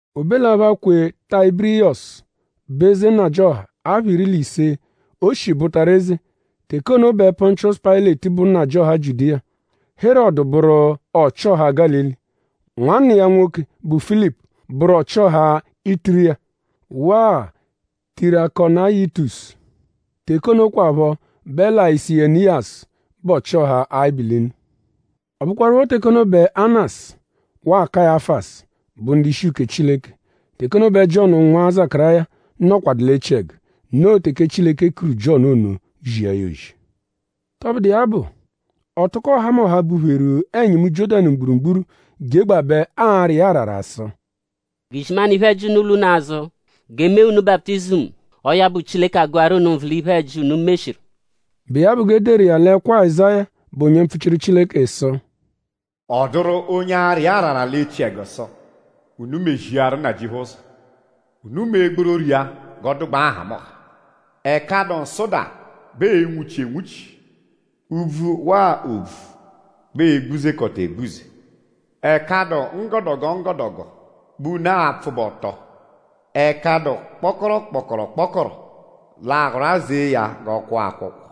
O be l'apha, kwe Tayibiriyọsu, bụ eze nnajịoha apha iri l'ise, o shi bụtaru eze; teke ono bẹ Pọnchiosu Payịleti bụ nnajịoha Jiudiya; Herọdu bụru ọchi-ọha Gálili; nwanna iya nwoke, bụ Filipu bụru ọchi-ọha Ituriya; waa Tirakonayitisu; teke ono kwaphọ bẹ Layiseniyasu bụ ọchi-ọha Abilinu. Ọ bụkwarupho teke ono bẹ Anasu; waa Kayafasu bụ ndu-ishi uke Chileke; teke ono bẹ Jiọnu nwa Zakaráya nọkwadu l'echiẹgu; noo teke Chileke kuru Jiọnu ono; zia ya ozi. Tọbudu iya bụ; ọ tụko ọhamoha, bupheru ẹnyimu Jiọ́danu mgburugburu jegbabẹ ara iya arara sụ: “G'izimanụ iphe-ẹji unu lwa unu azụ; g'e mee unu baputizimu; ọo ya bụ Chileke agụaru unu nvụ l'iphe-ẹji, unu meshiru.” Bụ iya bụ g'e deru iya l'ẹkwo Azáya, bụ onye mpfuchiru Chileke sụ: “Ọ dụru onye ara iya arara l'echiẹgu sụ: ‘Unu meziaru Nnajịuphu ụzo. Unu mee gbororo iya g'ọ dụgbaa nhamụnha. Ẹka dụ nsụda bẹ ee-nwuchi enwuchi. Úbvú waa òbvú bẹ ee-gbuzekọta egbuze. Ẹka dụ nggọdogo nggọdogo bẹ unu a-pfụbe ọto. Ẹka dụ kpọkoro-kpọkoro-kpọkoro l'aa-rwazee ya g'ọ kwọ akwọkwo.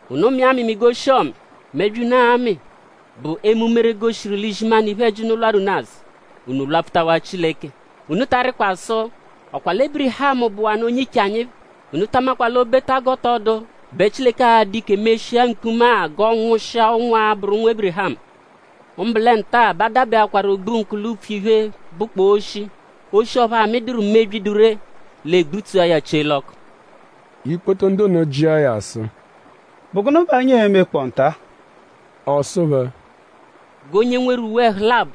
Unu mịa amịmi g'oshi-ọmi. Mebyi, unu aa-mị bụ eme umere, goshiru l'izimanụ iphe-ẹji unu lwarụ unu azụ; unu lwapfutawaa Chileke. Unu ta arịkwa sụ:?Ọ kwa lẹ Ébirihamu bụwanu onye-iche anyi phẹ. Unu ta amakwa l'o -beta g'ọ tọ dụ bẹ Chileke a-dụ ike meshia mkpuma-a g'ọ nwụshia ụnwu, a-bụru ụnwu Ébirihamu. Mbụ lẹ nta-a bẹ a dabẹakwaru ogbunkụ l'upfu iphe, bụkpoo oshi. Oshi ọphu amịduru mebyi, dụ ree; l'e gbutsua ya chie l'ọku.” Ikpoto ndu ono jịa ya sụ: “?Bụ gụnu bẹ anyi e-mekpọo nta-a?” Ọ sụ phẹ: “G'onye nweru uwe ẹhu labọ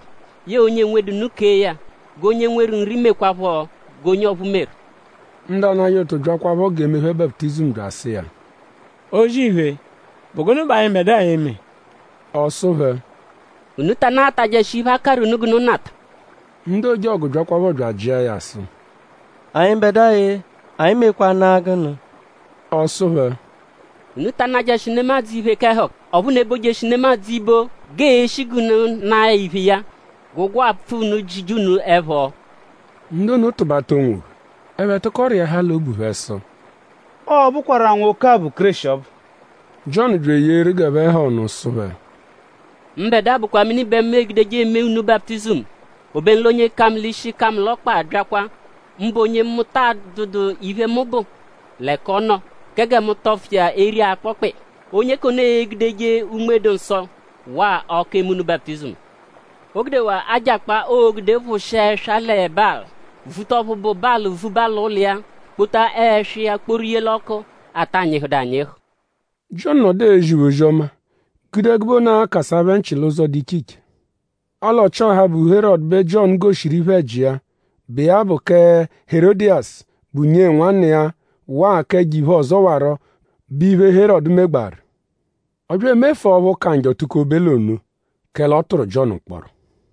yẹe onye enwedu nụ kee ya. G'onye nweru nri mekwaaphọ g'onye ọphuu meru.” Ndu anajẹ ụtu byakwaphọ g'e mee phẹ baputizimu bya asụ iya: “O-zì-iphe;?bụ gụnu bẹ anyịbedua e-me?” Ọ sụ phẹ: “Unu ta anaghatajẹshi iphe, a karụ unu g'unu nata.” Ndu ojọgu byakwaphọ bya ajịa ya sụ: “Anyịbedua-e;?Anyi mekwanụ-a gụnu?” Ọ sụ phẹ: “Unu ta anajẹshi nemadzụ iphe k'ẹhuka; ọphu unu ebojeshi nemadzụ ibo g'ee-shi g'unu naa ya iphe iya. G'ụgwo, aapfụ unu jije unu ẹpho.” Ndu ono tụbata onwophẹ. Ẹphe tụko rịahaa l'obu phẹ sụ: “Ọo-bụkwaru-a nwoke-a bụ Kéreshi ọbu.” Jiọnu bya eyeeru g'ẹphe ha ọnu sụ phẹ: “Mbẹdua bụkwa mini bẹ mu egudeje eme unu baputizimu. Obenu l'onye ka mu l'ishi ka mu l'ọkpa abyakwa; mbụ onye mu ta adụdu iphe, mu bụ l'ẹka ọ nọ kẹ gẹ mu tọfu iya eri akpọkpa iya. Onye k'ono e-gudeje Unme-dụ-Nsọ; waa ọku eme unu baputizimu. O gudewaa ajakpa, oo-gude phụshia ẹswa lẹ balị; vuta ọphu bụ balị vuba l'ụlo iya; kpota ẹswa iya kporu ye l'ọku, ata nyịhudu anyịhu.” Jiọnu nọdu ezi phẹ ozi-ọma gude ẹgube ono akasa phẹ nchị l'ụzo, dụ iche iche. Ọle Ọchi-ọha, bụ Herọdu bẹ Jiọnu goshiru iphe-ẹji iya, bụ iya bụ kẹ Herọdiyasu, bụ nyee nwanna iya; waa k'ẹjo-iphe ọzowaro, bụ iphe, Herọdu megbaaru. Ọ bya emefua ọphu ka njọ tukobe l'ono; kẹle ọ tụru Jiọnu mkpọro.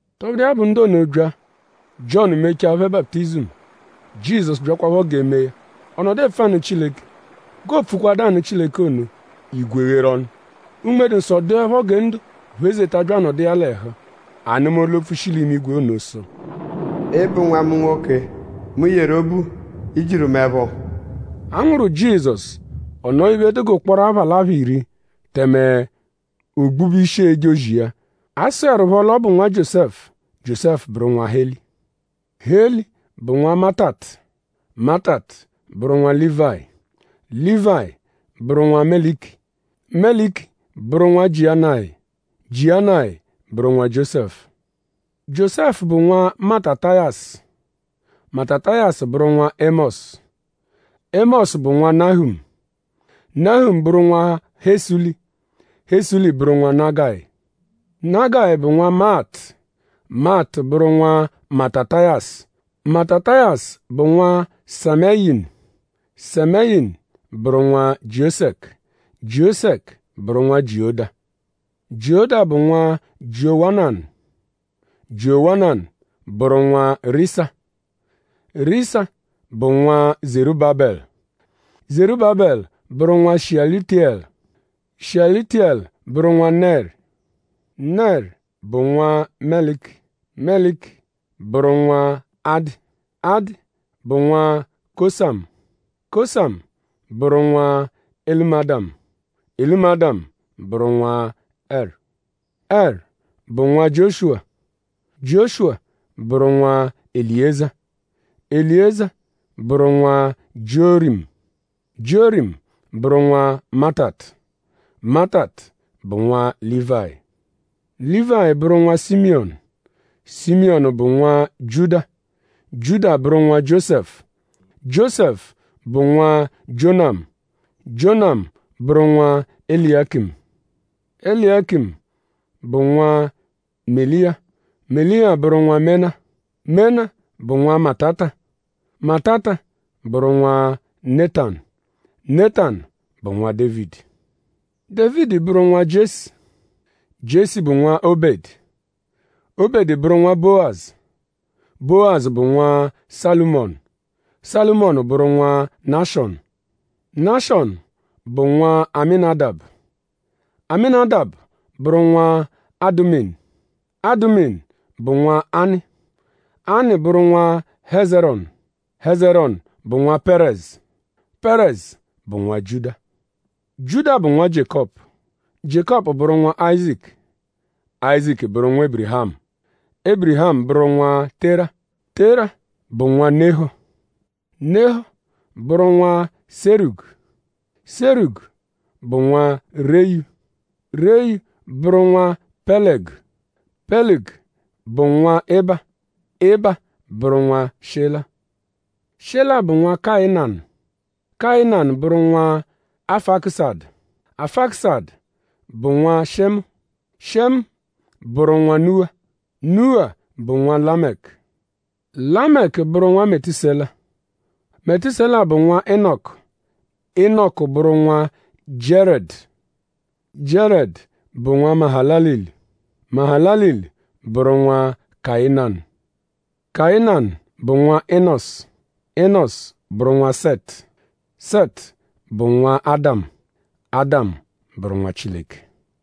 Tọbudu iya bụ; ndu ono bya; Jiọnu mechaa phẹ baputizimu; Jizọsu byakwaphọ g'e mee ya; ọ nọdu epfu anụ Chileke. G'oopfukwadu anụ Chileke ono; igwe gheru ọnu. Unme-dụ-Nsọ dụepho gẹ ndo phezeta bya anọdu iya l'ẹhu. A nụma olu-opfu, shi l'imigwe ono sụ: “Ị bụ nwa mu nwoke, mu yeru obu. I jiru mu ẹpho.” A nwụru Jizọsu; ọ nọo iphe, dụ g'ụkporo apha l'apha iri; tẹme o gbube ishi eje ozi iya. A sụerupho l'ọ bụ nwa Jiósẹfu; Jiósẹfu bụru nwa Heli. Heli bụ nwa Matatu; Matatu bụru nwa Lívayi; Lívayi bụ nwa Meliki; Meliki bụru nwa Jianayi; Jianayi bụru nwa Jiósẹfu. Jiósẹfu bụ nwa Matatayasu; Matatayasu bụru nwa Émọsu; Émọsu bụ nwa Nahumu; Nahumu bụru nwa Hesuli; Hesuli bụru nwa Nagayi. Nagayi bụ nwa Maatu; Maatu bụru nwa Matatayasu; Matatayasu bụ nwa Sẹmeyinu; Sẹmeyinu bụru nwa Jiosẹku; Jiosẹku bụru nwa Jioda. Jioda bụ nwa Jiowananu; Jiowananu bụru nwa Risa; Risa bụ nwa Zerúbabelu; Zerúbabelu bụru nwa Shiyálutiyẹlu; Shiyálutiyẹlu bụru nwa Nẹri. Nẹri bụ nwa Meliki; Meliki bụru nwa Adi; Adi bụ nwa Kosamu; Kosamu bụru nwa Elumadamu; Elumadamu bụru nwa Ẹru. Ẹru bụ nwa Jioshuwa; Jioshuwa bụru nwa Eliyiza; Eliyiza bụ nwa Jiọrimu; Jiọrimu bụru nwa Matatu; Matatu bụ nwa Lívayi. Lívayi bụru nwa Simiyọnu; Simiyọnu bụ nwa Jiuda; Jiuda bụru nwa Jiósẹfu; Jiósẹfu bụ nwa Jionamu; Jionamu bụru nwa Eláyekimu. Eláyekimu bụ nwa Meliya; Meliya bụru nwa Mena; Mena bụ nwa Matata; Matata bụru nwa Nétanu; Nétanu bụ nwa Dévidi. Dévidi bụru nwa Jiesi; Jiesi bụ nwa Óbẹdu; Óbẹdu bụru nwa Bówazu; Bówazu bụ nwa Sálụmonu; Sálụmonu bụru nwa Náshọnu. Náshọnu bụ nwa Amínadabu; Amínadabu bụru nwa Aduminu; Aduminu bụ nwa Anị; Anị bụru nwa Hézerọnu; Hézerọnu bụ nwa Pẹ́rezu; Pẹ́rezu bụru nwa Jiuda. Jiuda bụ nwa Jiékọpu; Jiékọpu bụru nwa Áyizaku; Áyizaku bụ nwa Ébirihamu; Ébirihamu bụru nwa Tera; Tera bụ nwa Nehọ; Nehọ bụru nwa Sérugu; Sérugu bụ nwa Reyu; Reyu bụru nwa Pẹlegu; Pẹlegu bụ nwa Iba; Iba bụru nwa Shela. Shela bụ nwa Kayinanu; Kayinanu bụru nwa Afakusadu; Afakusadu bụ nwa Shemu; Shemu bụru nwa Nuwa; Nuwa bụ nwa Lamẹku. Lamẹku bụru nwa Metusela; Metusela bụ nwa Inọku; Inọku bụru nwa Jiarẹdu; Jiarẹdu bụ nwa Mahalalilu; Mahalalilu bụru nwa Kayinanu. Kayinanu bụ nwa Inọsu; Inọsu bụru nwa Sẹtu; Sẹtu bụ nwa Ádamu; Ádamu bụru nwa Chileke.